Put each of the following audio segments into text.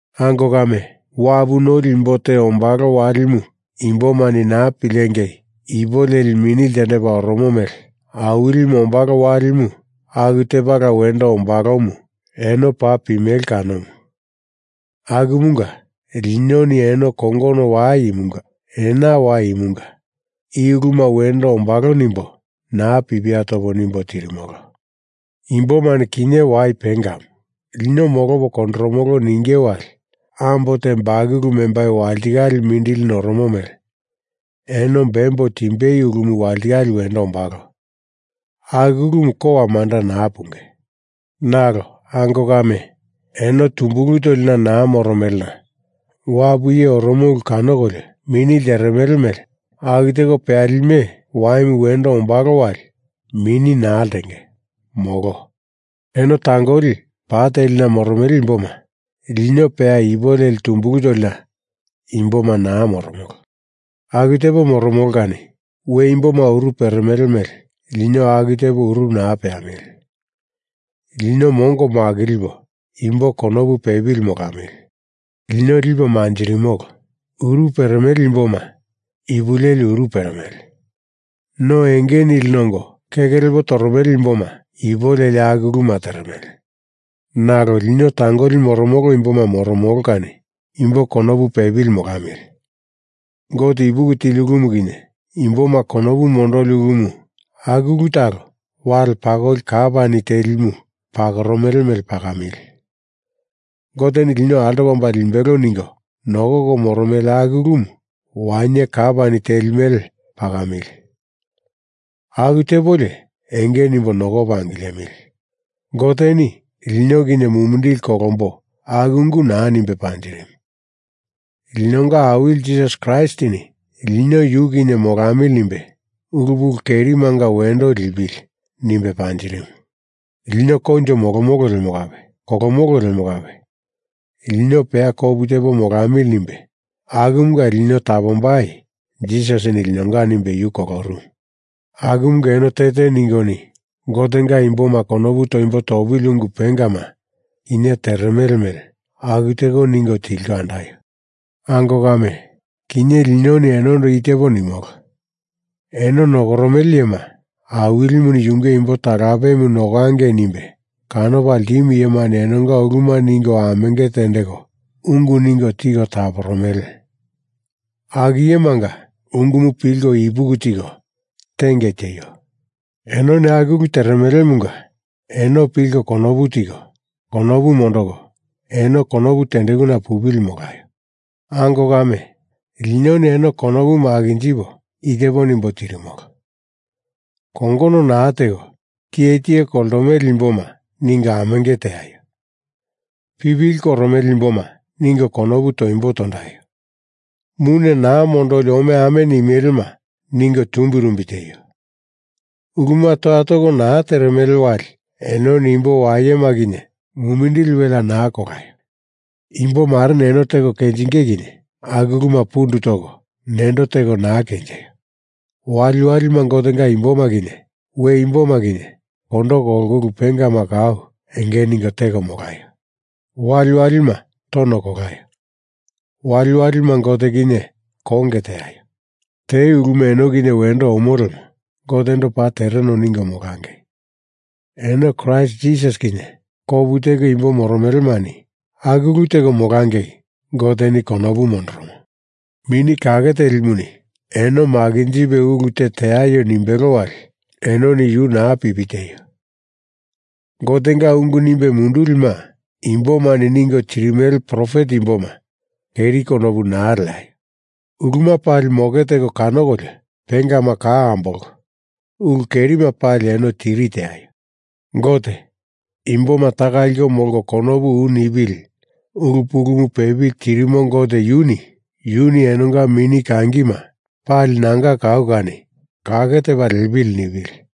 Ango kame, wapu noli imbo te ombalo walimu imbomani naa pilengei ipu leli mini ltendepa oromo mele Awilimu ombalo walimu aku tepala wendo ombalomu eno paa pimele kanomu. Akumunga, linoni eno kongono wai imunga ena wai imunga i uluma wendo ombalo nimbo naa pipia topo nimbo tirimolo. Imbomani kinye wai pengamu, lino molopo kondoromolo ninge wali ambo te bakulu membai walitikale mindili noromo mele eno bembo timbei ulumu walitikale wendo ombalo. Aku ulumu kowa manda naa punge. Nalo ango kame, eno tumbulu tolina naa moromelena wapu iye oromo ulu kanokolio mini lteremele mele aku teko peyalime waimu wendo ombalo wali mini naa ltenge. Molo. Eno tangoli pa telina moromele imboma. Lino peya ipu leli tumbulu tolina imboma naa moromolo. Aku tepo moromolo kani we imboma uru peremele mele lino aku tepo uru naa peamili. Lino mongo makilipo imbo konopu pepili molamili. Lino lipo manjirimolo. Uru peremele imboma ipu leli uru peremele. No enge nili nongo keke lepo toromele imboma ipu leli aku uluma teremele. Nalo lino tangoli moromolo imboma moromolo kani imbo konopu pepili molamili. Gote ipuki tili ulumu kinye, imboma konopu mondoli ulumu aku ulu talo wali pakoli kapani telimu pakoromele mele pakamili. Goteni lino altopa omba limbelo ningo nokoko moromele aku ulumu wainye kapani teli mele pakamili. Aku tepolio enge nimbo nokopo angilemili. Goteni lino kinye mumindili kolombo aku ungu naa nimbe panjirimu. Linonga Awili Jisas Kraistini lino yu kinye molamili nimbe ulu pulu kerimanga wendo lipili nimbe panjirimu. Lino koinjo molomolo lemo kape kolomolo lemo kape lino peya kopu tepo molamili nimbe akumunga lino tapombai Jisasini linonga nimbe yu kolorumu. Akumunga eno te te ningoni Gotenga imboma konopu toimbo topili ungu pengama kinye teremele mele aku teko ningo tilko andaio. Ango kame, kinye linoni enondo i tepo nimolo, eno nokoromele iyema, Awilimuni yunge imbo talapemu nokangei nimbe kanopa ltimu iyemani enonga uluma ningo amenge tendeko ungu ningo tiko taporomele. Aku iyemanga ungumu pilko ipuki tiko tiengei tieio. Enoni aku ulu teremelemunga eno pilko konopu tiko konopu mondoko eno konopu tendekuna pupili molaio. Ango kame, linoni eno konopu makinjipo i tepo nimbo tirimolo: Kongono naa teko tiye tiye koltomele imboma ningo amenge teaio. Pipili koromele imboma ningo konopu toimbo tondaio. Mune naa mondoli omeame nimelema ningo tumbirumbi tieio. Uluma toya toko naa teremele wali enoni imbo wayema kinye mumindili welea naa kolaio. Imbo mareni eno teko kenjinge kinye aku uluma pundu toko nendo teko naa kenjeio. Waliwalima Gotenga imboma kinye we imboma kinye kondo kolko ulu pengama kau enge ningo teko molaio. Waliwalima tono kolaio. Waliwalima Gote kinye konge teaio. Te uluma eno kinye wendo omo lemo Gotendo paa tereno ningo molangei. Eno Kraist Jisas kinye kopu teko imbo moromelemani aku ulu teko molangei Goteni konopu mondoromo. Mini Kakemuni eno makinjipe ulu te teaio nimbelo wali enoni yu naa pipi tieio. Gotenga ungu nimbe mundulima imboma ningo tirimele profet imboma keri konopu naa leaio. Uluma pali moke teko kanokolio, pengama kau ambolko, ulu kerima pali eno tiri teaio. Gote, imboma taka liko molko konopu u nipili ulu pulumu pepili tirimo Gote yunu, yuni enonga mini kangima pali nanga kau kani kake tepa liepili nipili.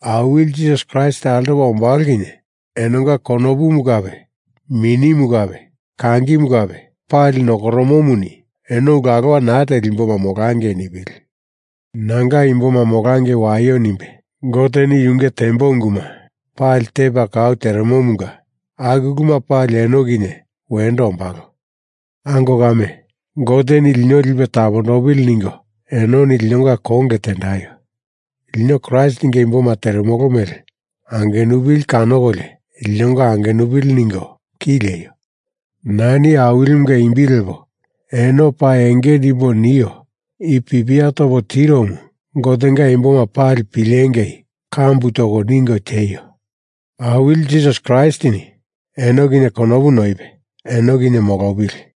Awili Jisas Kraist altopa ombalo kinye enonga konopumu kape minimu kape kangimu kape pali nokoromomuni eno ulu alowa naa teli imboma molangei nipili. Nanga imboma molangei waio nimbe Goteni yunge tembo unguma pali tepa kau teremomunga aku uluma pali eno kinye wendo ombalo. Ango kame, Goteni lino lipe tapondopili ningo enoni linonga konge tendaio. Lino Kraistinga imboma teremolo mele angenupili kanokolio linonga angenupili ningo ki lieio. Nani Awilimunga imbi lepo eno paa enge nimbo nio i pipia topo tiromu Gotenga imboma pali pilengei kambu toko ningo tieio. Awili Jisas Kraistini eno kinye konopu noipe eno kinye molopili.